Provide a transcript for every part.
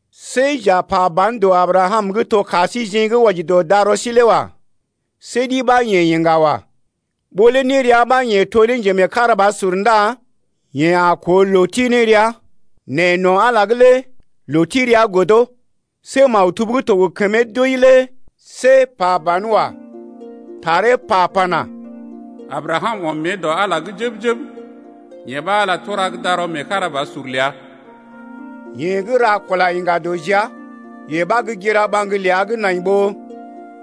See j’a pa ban dɔ Abrakam gə́ to ka síjeḛ gə́ wɔji dɔ darɔ sí lé wa. See ɗi ɓa yeḛ iŋga wa. Ɓó lé nérea ɓa yeḛ to ne njemeekarabasur ndá yeḛ a koo loo ti ne rəa, nɛ no̰ Ala’g lé loo ti rəa godo. See maktub gə́ to gə kəmee doi lé see pa banwa. Taree pa pana: Abrakam ɔm mée dɔ Ala’g jəb-jəb, yee ɓa Ala tura gə́ darɔ meekarabasur ləa. Yeḛ gə́ ra kula iŋga dɔ jia, yee ɓa gə́ gira ɓaŋg ləa gə́ nai ɓó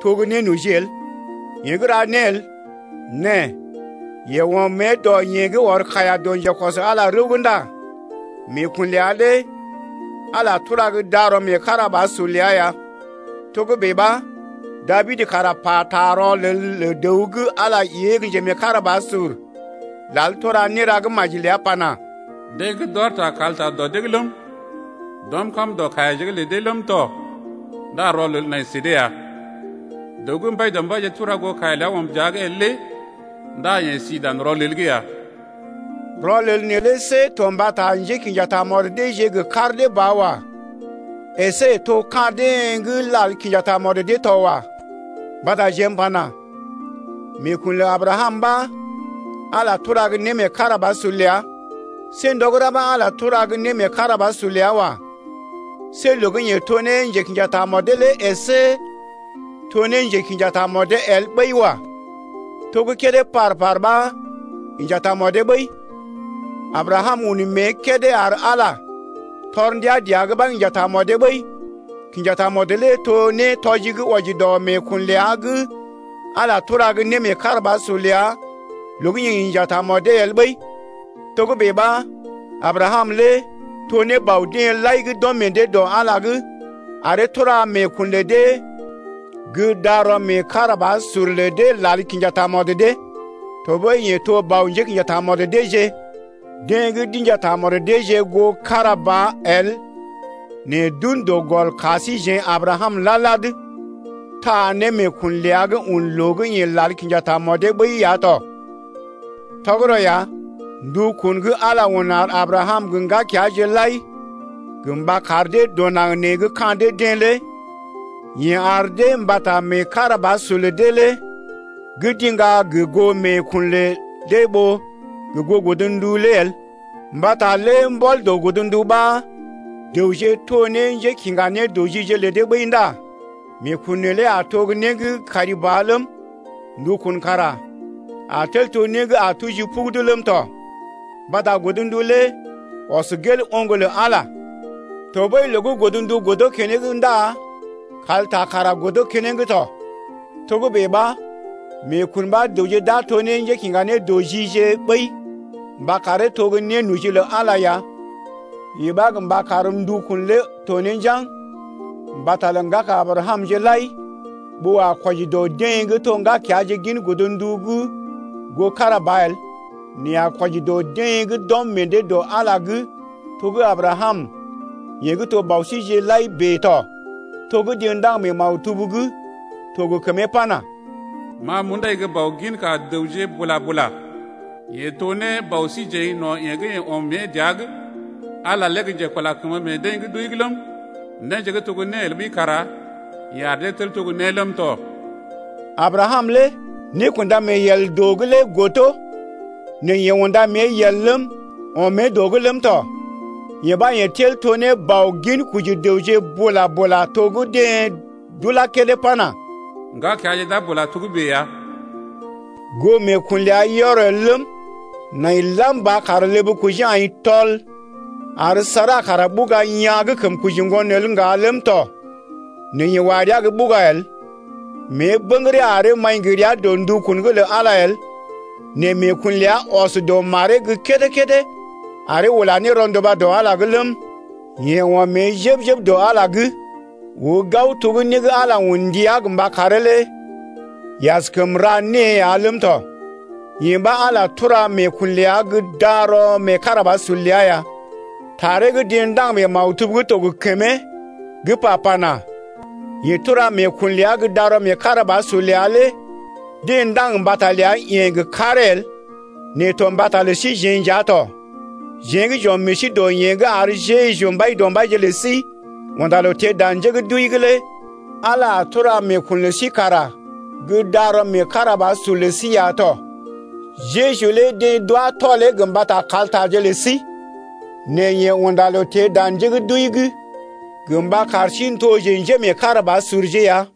to gə́ nénoji el. Yeḛ gə́ ra né el nɛ yeḛ ɔm mée dɔ yeḛ gə́ ɔr kaiya dɔ njekɔs Ala rəw’g ndá meekun ləa lé Ala lé tura gə́ darɔ meekarabasur ləa ya. Togə́bè ɓa, Dabid kara pata rɔlel lə dəw gə́ Ala ée gə́ njemeekarabasur lal tura néra gə́ maji ləa pana: Deḛ gə́ d’ɔr ta kalta dɔ dee’g ləm, D’ɔm kam dɔ kaiyaje’g lə dee ləm tɔ Ndá rɔlel nai sə dee ya. Dəw gə́ Mbaidɔmbaije tura goo kaiya ləa ɔm dəa’g el lé Ndá yeḛ si dan rɔlel’g ya. Rɔlel neelé see to mbata njékḭja tamɔd deeje gə kar dee ba wa. Esé to ka̰ deḛ gə́ lal kinja tamɔd dee to wa. Mbata jeḛ m’pana: Meekun lə Abrakam ɓa Ala tura gə́ némeekarabasur ləa. See ndɔ gə́ ra ɓa Ala tura gə́ némeekarabasur ləa wa. See loo gə́ yeḛ to ne njekḭja tamɔdee lé əsé to ne njekḭja tamɔdee el ɓəi wa. To gə́ kédé par-par ɓa inja tamɔdee ɓəi. Abrakam un mée kédé ar Ala tɔr ndia dəa’g ɓa inja tamɔdee ɓəi. Kinja tamɔd lé to ne nétɔji gə́ wɔji dɔ meekun ləa gə́ Ala tura gə́ némeekarabasur ləa loo gə́ yeḛ inja tamɔdee el ɓəi. Togə́bè ɓa Abrakam lé to ne bɔ deḛ lai gə́ d’ɔm meḛ dee dɔ Ala’g aree tura meekun lə dee gə́ darɔ meekarabasur lə deḛ gə́ lal kinja tamɔd dee lé. Tɔɓəi yeḛ to bɔ njékḭja tamɔd deeje, deḛ gə́ d’inja tamɔd deeje goo kára ba el nɛ d’un dɔ gɔl ka síjeḛ Abrakam lad-lad, taa ne meekun ləa gə́ un loo gə́ yeḛ lal kinja tamɔdee ɓəi lé ya tɔ. Tɔgərɔ ya, ndukun gə́ Ala un ar Abrakam gə ŋgakeaje lai gə mba kar dee dɔ naŋg nee gə́ ka̰ dee-deḛ lé yeḛ ar dee mbata meekarabasur lə dee gə́ d’iŋga gə goo meekun lə dee ɓó gə goo godndu lé el. Mbata lé mbɔl dɔ godndu ɓa dəwje to ne njékiŋga nédɔji lə dee ɓəi ndá meekun neelé a to gə́ né gə́ kari ba ləm, ndukun kara a tel to né gə́ a tuji pugudu ləm tɔ. Mbata godndu lé ɔs gel oŋg lə Ala, tɔɓəi loo gə́ godndu godo keneŋ ndá kalta kara godo keneŋ tɔ. Togə́bè ɓa meekun ɓa dəwje d’a to ne njékiŋga nédɔjije ɓəi mba karee to gə́ nénoji lə Ala ya. Yee ɓa gə mba kar ndukun lé to ne njaŋg mbata lə ŋgaka Abrakamje lai ɓó a kwɔji dɔ deḛ gə́ to gə́ ŋgakeaje gin godndu’g goo kára ba el nɛ a kwɔji dɔ deḛ gə́ d’ɔm meḛ dee dɔ Ala’g to gə́ Abrakam yeḛ gə́ to bɔ síjeḛ lai bèe tɔ, to gə́ deḛ ndaŋg mee maktub gə́ to gə kəmee pana: Ma m’undai gə́ bɔ ginka dəwje bula-bula. Yeḛ to ne bɔ síjeḛ no̰ yeḛ gə́ yeḛ ɔm mée dəa’g, Ala lé gə́ njekula kəmə meḛ deḛ gə́ d’wəi ləm, néje gə́ to gə́ né el ɓəi kara yeḛ ar dee tel to gə́ né ləm tɔ. Abrakam lé nékunda mee yel dɔ’g lé godo nɛ yeḛ unda mée yel ləm, ɔm mée dɔ’g ləm tɔ. Yee ɓa yeḛ tel to ne bɔ ginkoji dəwje bula-bula to gə́ deḛ d’ulá kédé pana: Ŋgakeaje d’a bula togə́bè ya. Goo meekun ləa yɔr el ləm, nai lam ba kar ləb kojee aḭ tɔl ar Sara kara ɓuga yaa̰ gə́ kəm koji ŋgon el ŋga ləm tɔ nɛ yeḛ wa rəa gə́ ɓuga el. Mée bə̰gəree aree maḭ gə rəa dɔ ndukun’g lə Ala el. Nɛ meekun ləa ɔs dɔ maree’g gə́ kédé-kédé aree ula ne rɔnduba dɔ Ala’g ləm, yeḛ ɔm mée jəb-jəb dɔ Ala’g oo gao to gə́ né gə́ Ala un ndia gə mba karee lé yeḛ askəm ra née ya ləm tɔ. Yee ɓa Ala tura meekun ləa gə́ darɔ meekarabasur ləa ya. Taree gə́ deḛ ndaŋg mee maktub gə́ to gə kəmee gə́ pa pana: Yeḛ tura meekun ləa gə́ darɔ meekarabasur ləa lé deḛ ndaŋg mbata ləa-yeḛ gə karee el nɛ to mbata lə síjeḛ nja tɔ. Jeḛ gə́ j’ɔm meḛ sí dɔ yeḛ gə́ ar Jeju Mbaidɔmbaije lə sí unda loo teḛ dan njé gə́ d’wəi’g lé Ala a tura meekun lə sí kara gə́ darɔ meekarabasur lə sí ya tɔ. Jeju lé deḛ d’wá tɔlee gə mbata kaltaje lə sí nɛ yeḛ unda loo teḛ dan njé gə́ d’wəi’g gə mba kar sí n’toje njémeekarabasurje ya.